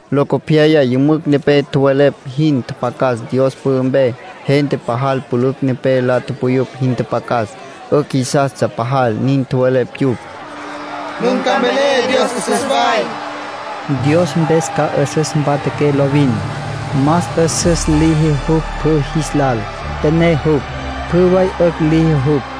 Locopyaya yümücj nepé tjowelepj jin tjapjacas Dios pü'ü mpe. Gente pajal pülücj nepé la tupuyupj jin pjactsja. 'Ücj jisastsja pajal. Nin tjowelepj yupj: “Nun ca mvelé Dios 'üsüs way. Dios mpes ca 'üsüs mpatjaqué lovin. Más 'üsüs liji jupj pjü jis lal. Püné jupj; pjü way 'ücj liji jupj.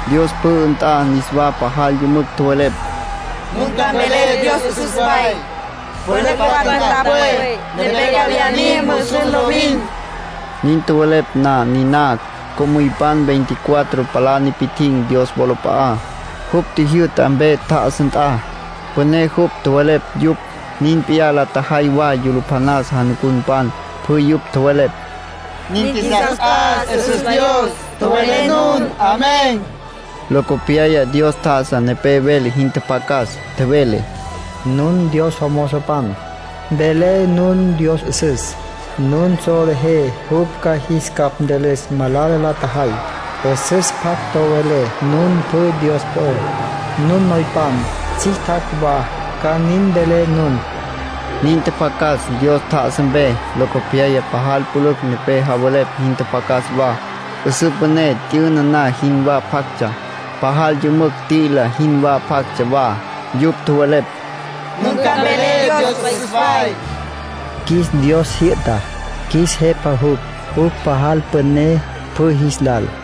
Dios pü'ü nt'a niswa pajal yümücj tjowelepj: “Nun ca mvelé Dios 'üsüs way. Pülücj patja nt'a pwe, nepé ca viyá mim musus lovin.” Nin tjowelepj na niná, co'müypan veinticuatro palá nipi'tjin̈ Dios wolap'a'á, jupj tjijyü'ta mpe tjá'asa nt'a. Püné jupj, tjowelepj yupj. Nin p'iyá la tjajay wa yulupjanas janucunpan. Pjü yupj tjowelepj: “Nin qjuisas t'as. 'Üsüs Dios, tjowelé nun.” Locopyaya Dios tjá'asa nepé vele jin tjapjacas. Tjevele: “Nun Dios jomozopan, mvelé nun Dios 'üsüs. Nun solejé jupj ca jis capj ntülüs malala la tjajay. 'Üsüs pjac tjowelé nun pjü, Dios po'ó; nun noypan, tsjictjacj wa, ca nin mvelé nun”, nin tjapjacas, Dios tjá'asa mpe. Locopyaya pajal pülücj nepé javelepj jin tjapjacas wa. 'Üsǘ püné t'yüna na jinwá pjactsja. Pajal yümücj t'i'ila jin pjactsja wa. Yupj tjowelepj: “Nun ca mvelé Dios 'üsüs way. Qjuis Dios jyü'ta. Qjuis Jepa jupj. Jupj pajal püné pjü jis lal.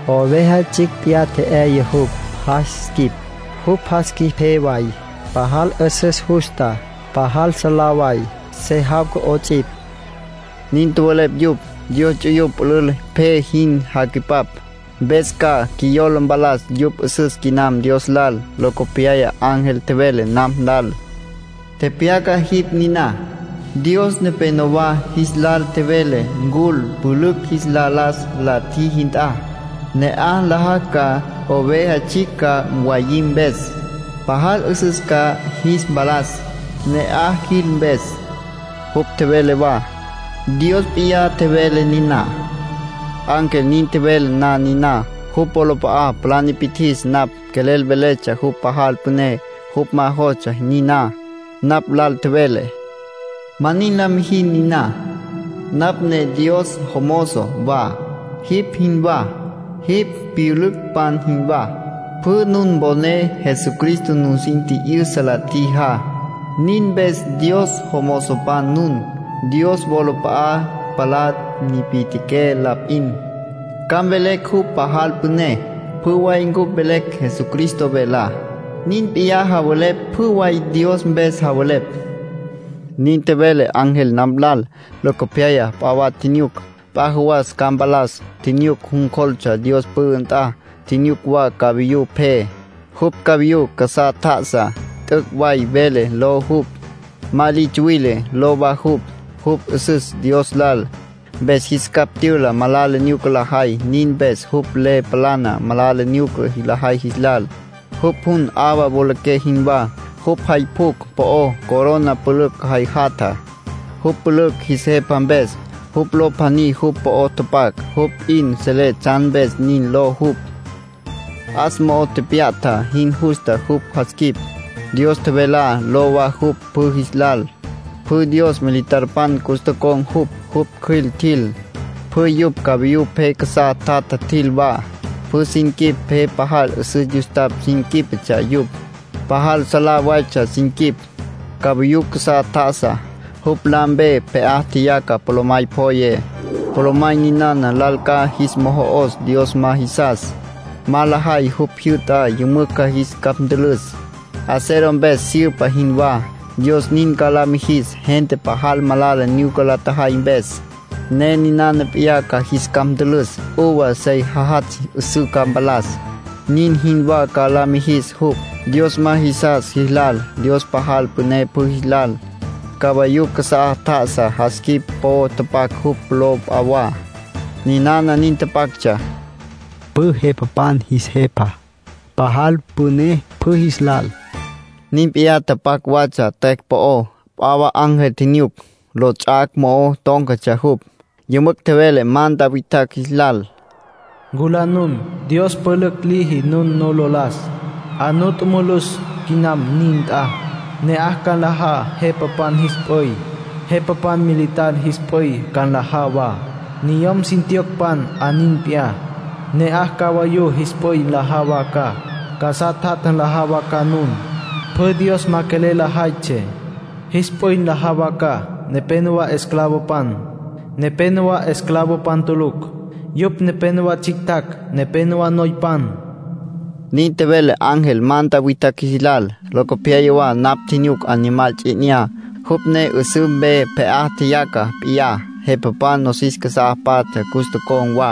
Oveja Tsjicj p'iyá tje'yaya jupj jas quip. Jupj jas quip pje way, pajal 'üsüs justa, pajal salá way. Se jawca 'ots'ipj”, nin tjowelepj yupj. (Dios ts'uyupj pülül pje sin jacüipap, mpes ca qjuiyola mpalas yupj 'üsüs quinam Dios lal.) Locopyaya ángel tjevele napj lal: “Tepyaca jipj niná: ‘Dios nepénowa jis lal tjevele ncul pülücj jis la las la tjiji nt'a, ne'aj nlajacj ca Oveja Tsjicj ca mwayim mpes. Pajal 'üsüs ca jis mpalas, ne'aj jil mpes.’” Jupj tjevele wa: “Dios p'iyá tjevele niná”. Ángel nin tjevele na niná, jupj wolap'a'a palá nipi'tjis napj. Quelel veletsja jupj pajal püné. Jupj ma jostsja niná. Napj lal tjevele: “Ma nin la mijin niná. Napj ne Dios jomozo wa, jipj jinwá, jipj pyülücpan jinwá. Pjü nun poné Jesucristo nusin tji'yüsa la tjijá. Nin mpes Dios jomozopan nun. Dios wolap'a'a palá nipi'tjiqué la p'in. Ca mvelen jupj pajal püné. Pjü way cupj velecj Jesucristo velá. Nin p'iyá javelepj pjü way Dios mpes javelepj”, nin tjevele ángel napj lal. Locopyaya p'a wa tjinyuc, p'a jawas ca mpalas. Tjinyuc jun cjoltsja Dios pü'ü nt'a. Tjinyuc wa cavayú pje. Jupj, cavayú casá tja'asá, “T'üc' Way Vele” ló jupj. “Ma Li Tsuwile” ló wa jupj. Jupj 'üsüs Dios lal, mpes jis capj tyüla malala nyuca lajay. Nin mpes jupj le palana malala nyuca lajay jis lal. Jupj jun, 'awa wolaqué jinwá. Jupj jay pjucj po'ó corona pülücj jay jatja, jupj pülücj jis Jepa mpes. Jupj ló pjaní jupj po'o tapac, jupj p'in selé tsjan mpes nin ló jupj. 'As mo'o tepya'ta jin justa jupj jas quip. “Dios Tjevelá” ló wa jupj pjü jis lal. Pjü Dios militarpan cus tocon̈ jupj. Jupj cjüil tjil. Pjü yupj cavayú pje casá tjatja tjil wa. Pjü sin quip pje pajal 'üsüs yustapj sin quípetsja yupj. Pajal salá waytsja sin quip. Cavayú casá tjá'asa, jupj la mpe pje'á tjeyaca polomay pjoye. Polomay ninana lal ca jis mojo'os Dios ma jisas. Ma lajay jupj jyü'tá, yümücj ca jis capj ntülüs, acero mpes syüpa jinwá. Dios nin ca la mijis gente pajal malala nyuca la tjajay mpes, ne ninana p'iyá ca jis capj ntülüs. Uva sey jajatsj 'üsǘ ca mpalas, nin jinwá ca la mijis jupj, Dios ma jisas jis lal. Dios pajal püné pjü jis lal. Cavayú casá tja'asá, jas quip po'o tapac jupj ló p'a wa. Ninana nin tapactsja: PJÜ JEPAPAN JIS JEPA. PAJAL PÜNÉ PJÜ JIS LAL. Nin p'iyá tapac watsja tüecj po'ó. P'a wa ángel tjinyuc. Lots'ac' mo'o tón̈catsja jupj. Yümücj tjevele manta witjacj jis lal: “Nculá nun. Dios pülücj liji nun nu lo las. 'A nu tjumulus quinam nin nt'a. Ne'aj ca nlajá jepapan jis p'üy. Jepapan militar jis p'üy ca nlajá wa, niyom sin tjiyocpan 'a nin p'iyá. Ne'aj cavayú jis p'üy nlajá wa ca, casá tjatja nlajá wa ca nun. Pjü Dios ma quelel lajaytsjé, jis p'üy nlajá wa ca. Nepénowa esclavopan, nepénowa esclavopan tulucj. Yupj nepénowa tsjictjacj, nepénowa noypan”, nin tjevele ángel manta witjacj jis lal. Locopyaya wa napj tjinyuc Animal Ts'i 'Inyá, jupj ne 'üsǘ mpe pje'á tjeyaca p'iyá. Jepapan nosis casá patja cus tocon̈ wa.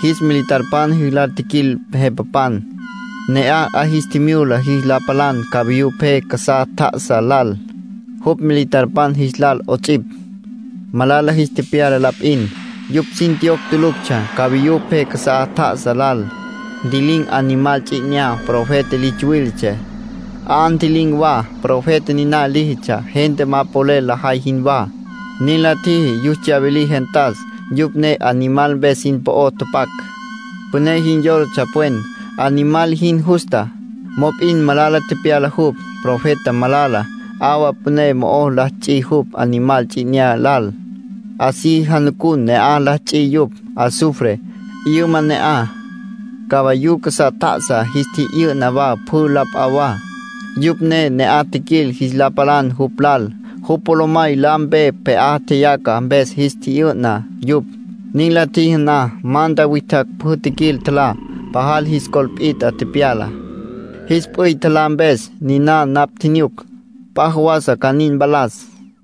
Jis militarpan jis lal tjiquil jepapan. Ne'aj 'a jis tjimyula jis la palan cavayú pje casá tjá'asa lal, jupj militarpan jis lal 'ots'ipj. Malala jis tepyala la p'in. Yupj sin tjiyocj tuluctsja cavayú pje casá tjá'asa lal. Ntji'lin̈ Animal Ts'i 'Inyá. Profeta li tsuwiletsjé, 'a ntji'lin̈ wa. Profeta niná líjitsja, gente ma polel lajay jinwá. Nin la tjiji yus tsyawilí gentas, yupj ne Animal mpes sin po'o tapac. Püné jin yólatsja pwen, Animal jin justa. Mop'in malala tepyala jupj, Profeta Malala. 'Awa püné mo'o la ts'i jupj Animal Ts'i 'Inyá lal. Así janucun ne'aj la ts'i yupj. Azufre, 'yüma ne'aj. Cavayú casá tjá'asa jis tji'yü'na wa pjü la p'a wa, yupj ne ne'aj tjiquil jis la palan jupj lal. Jupj polomay la mpe pje'á tjeyaca mpes jis tji'yü'na yupj. Nin la tjiji na, manta witjacj pjü tjiquil, tjalá. Pajal jis col pit'a tepyala, jis p'üy tjalá mpes. Niná napj tjinyuc, p'a jawasa ca nin mpalas.